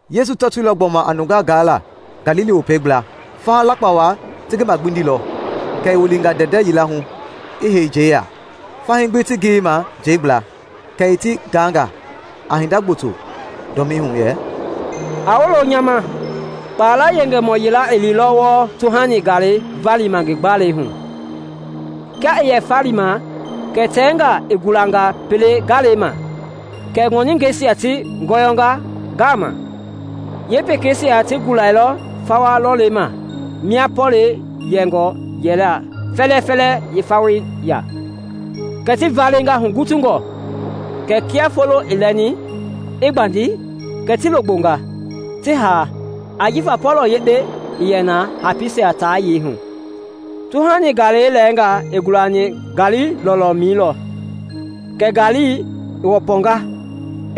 Yesu tɔtoilɔ gbɔma a nungaa gaala Galili Wopei gbla. Faha lakpa wa ti ngi magbindilɔ, kɛ i wilinga ndɛndɛ yila hu i hei njɛi ya, fahii gbi ti ngiyei ma njɛi gbla. Kɛ i ti gaanga a hinda gboto dɔmii hu yɛ, “A wolo nya ma! Kpala yengemɔ yila i liilɔ wɔɔ tuhani galei valima ngi gbalei hu. Kia i yɛ falima kɛ tɛngaa i gulanga pele galei ma, kɛ ŋɔningɛisia ti ngɔyɔnga ngama. Yeepekeisia ti gulailɔ fawa lɔlɔmɛi mia pɔlɛi yɛngɔ yɛla fɛlɛfɛlɛ fawei ya, kɛ ti valenga hugutungɔ. Kɛɛ kia foloi i lɛni, i gbandi, kɛ ti logbonga, ti ha, ajifa pɔlɔ yekpe ii yɛ na hapiisia ta yei hu. Tuhani galei lɛɛngaa i gulani ngaali lɔlɔmɛi lɔ, kɛ ngaali i wɔpɔnga,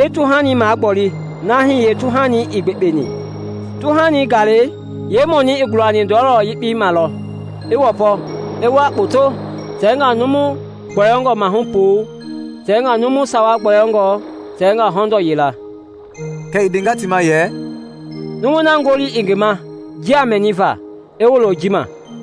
i tuhani magboli na hii yeetuhanii ii gbekpeni. Tuhani galei yeemɔnii i gulani ndɔlɔma yekpei lɔ ma, i wɔpɔ, i wua kpoto, tɛngaa numu gbɔyɔngɔ mahu puu, tɛngaa numu sawa gbɔyɔngɔ, tɛngaa hɔndɔɔ yila.” Kɛ i ndenga ti ma yɛ, “Numui na ngoli i ngi ma njia mɛniva; i wolo ji ma.”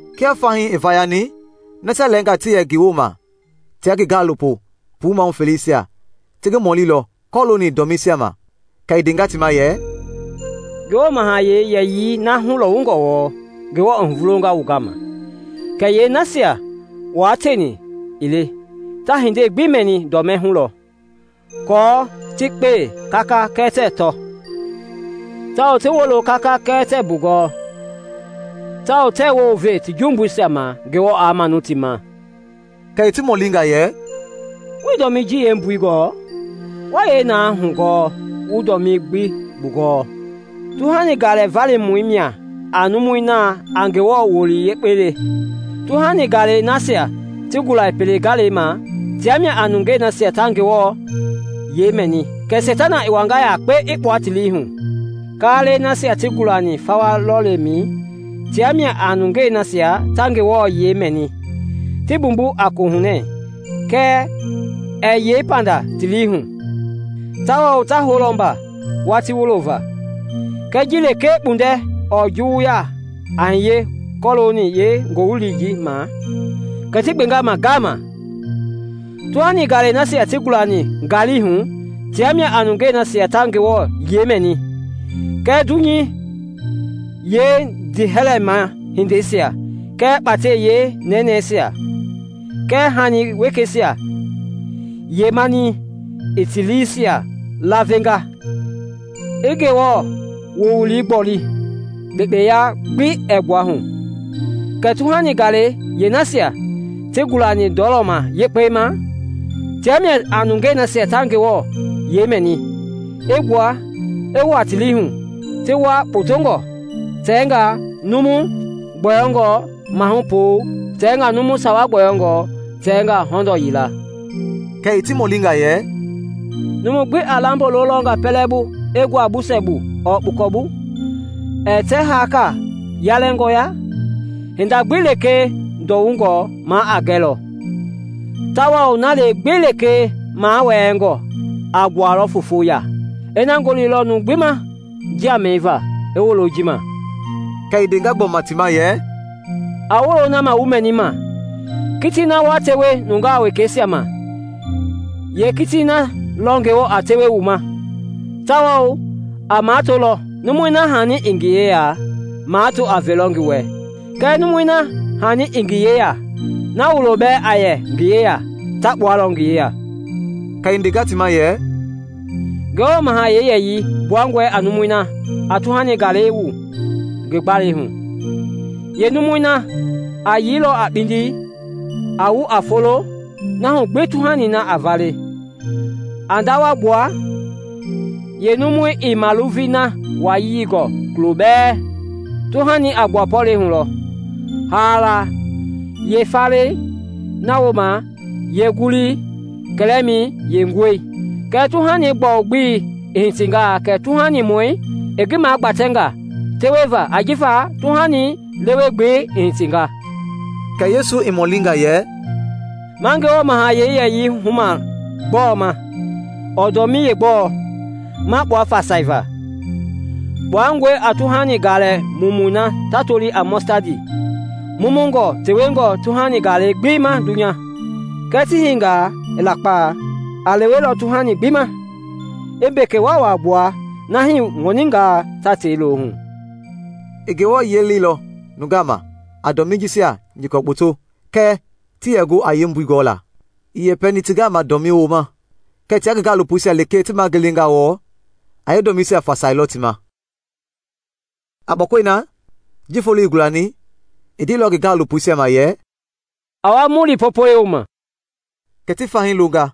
Kia fahii i vayani, nasia lɛɛngaa ti yɛ ngi woma tia ngi gaalopo puu mahu feleisia ti ngi mɔlilɔ kɔlooni dɔmiisia ma. Kɛ i ndenga ti ma yɛ, “Ngewɔ mahayɛi yɛyii na hulɔwungɔ wɔɔ, Ngewɔ i huvulonga wu gama. Kɛɛ yeenasia wua tieni ii le, ta hindei gbi mɛni dɔmii hu lɔ; aako ‘Ti kpee kaka kɛɛ tɛɛ tɔ, tawao ti wolo kaka kɛɛ tɛɛ mbugɔɔ, aako tɛɛ wounve ti jumbuisia ma Ngewɔ aa manu ti ma.’” Kɛ i ti mɔlinga yɛ, “Wuii dɔmii ji yeembui gɔɔ? Wa yee na hɔɔ gu wu dɔmii gbi bugɔɔ? Tuhani galɛ valimɔi mia a numui na a Ngewɔ wowili yekpei le. Tuhani galei nasia ta gula pele galei ma tia mia a nungei nasia ta Ngewɔ yiɛi mɛni, kɛ Seitana i wanga yakpe i kpua ti lii hu. Kaalɛi nasia ti gulani fawa lɔlɔmɛi tia mia a nungei nasia ta Ngewɔ yiɛi mɛni, ti mbumbu a kohunɛ; kɛɛ ɛɛ yei panda ti lii hu, tawao ta houlɔ mba watii wulo va. Kɛɛ ji lekee kpundɛ ɔɔ juwuya a hiye kɔlooni yeengoowili ma, kɛ ti gbenga ma ngama. Tuhani galei nasia ti gulani ngaali hu tia mia a nungei nasia ta Ngewɔ yiɛi mɛni, kɛɛ dunyei yeendiihɛlɛma hindeisia kɛɛ kpatɛi yeenɛnɛi kɛɛ hani wekeisia yeemanii i ti liisia laavenga, i Ngewɔ wowili gboli, kpekpeya gbi ɛɛ gbua hu. Kɛɛ tuhani galei yeenasia ti gulani ndɔlɔma yekpei ma, tia mia a nungei nasia ta Ngewɔ yiɛi mɛni, i wua ti lii hu, ti wua kpotongɔ, tɛngaa numu gbɔyɔngɔ mahu puu, tɛngaa numu sawa gbɔyɔngɔ, tɛngaa hɔndɔɔ yila.” Kɛ i ti mɔlinga yɛ, “Numu gbi a lambo lolɔnga pɛlei bu i ngua busɛ bu ɔɔ kpukɔ? Ɛɛ tɛ haaka yalɛngɔ ya? Hinda gbi lekee ndɔwungɔ ma a gɛlɔ, tawao na gbi lekee mawɛɛngɔ a gbualɔ foofo ya. Ina ngoli lɔ numu gbi ma njia mɛniva, i wolo ji ma!” Kɛ i ndenga gbɔma ti ma yɛ, “A wolo na ma wu mɛnima! Kitii na wa tewe nungaa wekeisia ma, yeekitii na lɔ Ngewɔ a tewe wu ma, tawao a matolɔ. Numui na hani i ngi yeya, mato a velɔ ngi wɛ; kɛɛ numui na hani ii ngi yeya, na wuloi bɛɛ a yɛ ngi yeya ta kpualɔ ngi yeya.” Kɛ i ndenga ti ma yɛ, “Ngewɔ mahayɛi yɛyii gbuangɔe a numui na a tuhani galei wu ngi gbalei hu. Yeenumui na a yii lɔ a kpindi, a wu a folo, na hu gbi tuhani na a vale, a ndawa gbua, yeenumui ii maluvei na wayii gɔɔ kulo bɛɛ. Tuhani a gbua pɔlɛi hu lɔ, haala yeefalei, na wooma yeengulii, kɛlɛmɛi yeenguɛi. Kɛɛ tuhani gbɔu-gbelei i hitingaa kɛ tuuhanimɔi i ngi magbatɛnga teweva ajifa tuhani lewe-gbelei i hitinga.” Kɛ Yesu i mɔlinga yɛ, “Ma Ngewɔ mahayɛi yɛyii huma gbɔɔ ma, ɔɔ dɔmii yeegbɔɔ ma kpua fasaiva? Kpuangɔe a tuhani galɛ mumu na ta loli a mɔstadi, mumungɔ tewengɔ tuhani galɛ gbi ma dunya, kɛɛ ti hiingaa i lakpa, a lewelɔ tuhani gbi ma, i mbeke waawaa gbua na hii ŋɔningɛisia ta tei lo hu.” I Ngewɔ yiɛi leilɔ nungaa ma a dɔmii jisia nyɔkɔ kpoto kia ti yɛ gu a yeembui gɔla. Ii yɛpɛni ti gama dɔmii wooma, kɛɛ tia ngi gaalopoisia lekee ti ma i gelengaa wɔɔ, a yeedɔmiisia fasailɔ ti ma. A kpɔkɔi na, ji foloi i gulani, i ndeilɔ ngi gaalopoisia ma yɛ, “A wa mu li Popɛi wooma.” Kɛ ti fahii longa,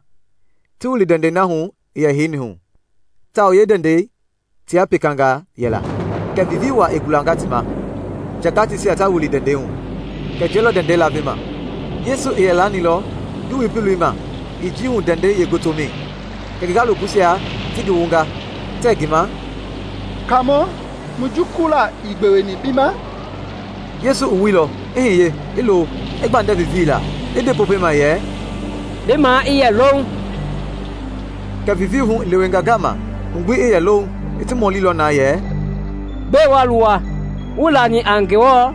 ti wili ndɛndɛi na hu i yɛ heini hu, tawao yeendɛndɛi tia pekangaa yɛla. Kɛ vivii wa i gulanga ti ma, nja gateisia ta wili ndɛndɛi hu, kɛ njɛi lɔ ndɛndɛi lavema. Yesu i yɛ laanilɔ ngi wui piloi ma i njii hu ndɛndɛi yeengotomɛi. Kɛ ngi gaalopoisia ti ngi wunga tɛɛ ngi ma, “Kaamɔ, mu jukulula ii gbeweni bi ma?” Yesu i wuilɔ, i hiye, i lo, i gbandɛ vivii la, i nde Popɛi ma yɛ, “Bi maa i yɛ louŋ!” Kɛ vivii hu i lewenga ngama, hu gbi i yɛ louŋ. I ti mɔlilɔ na yɛ, “Gbɛe wa luwa? Wuii lani a Ngewɔ?”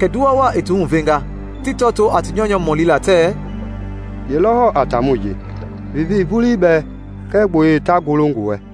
Kɛ nduwa wa i ti huvenga, ti tɔtoo a ti nyɔunyɔ mɔlila tɛɛ, “Ye lɔ hɔɔ a taamɔi ji, vivii vulii bɛɛ kɛɛ gboyei ta golo ngi wɛ?”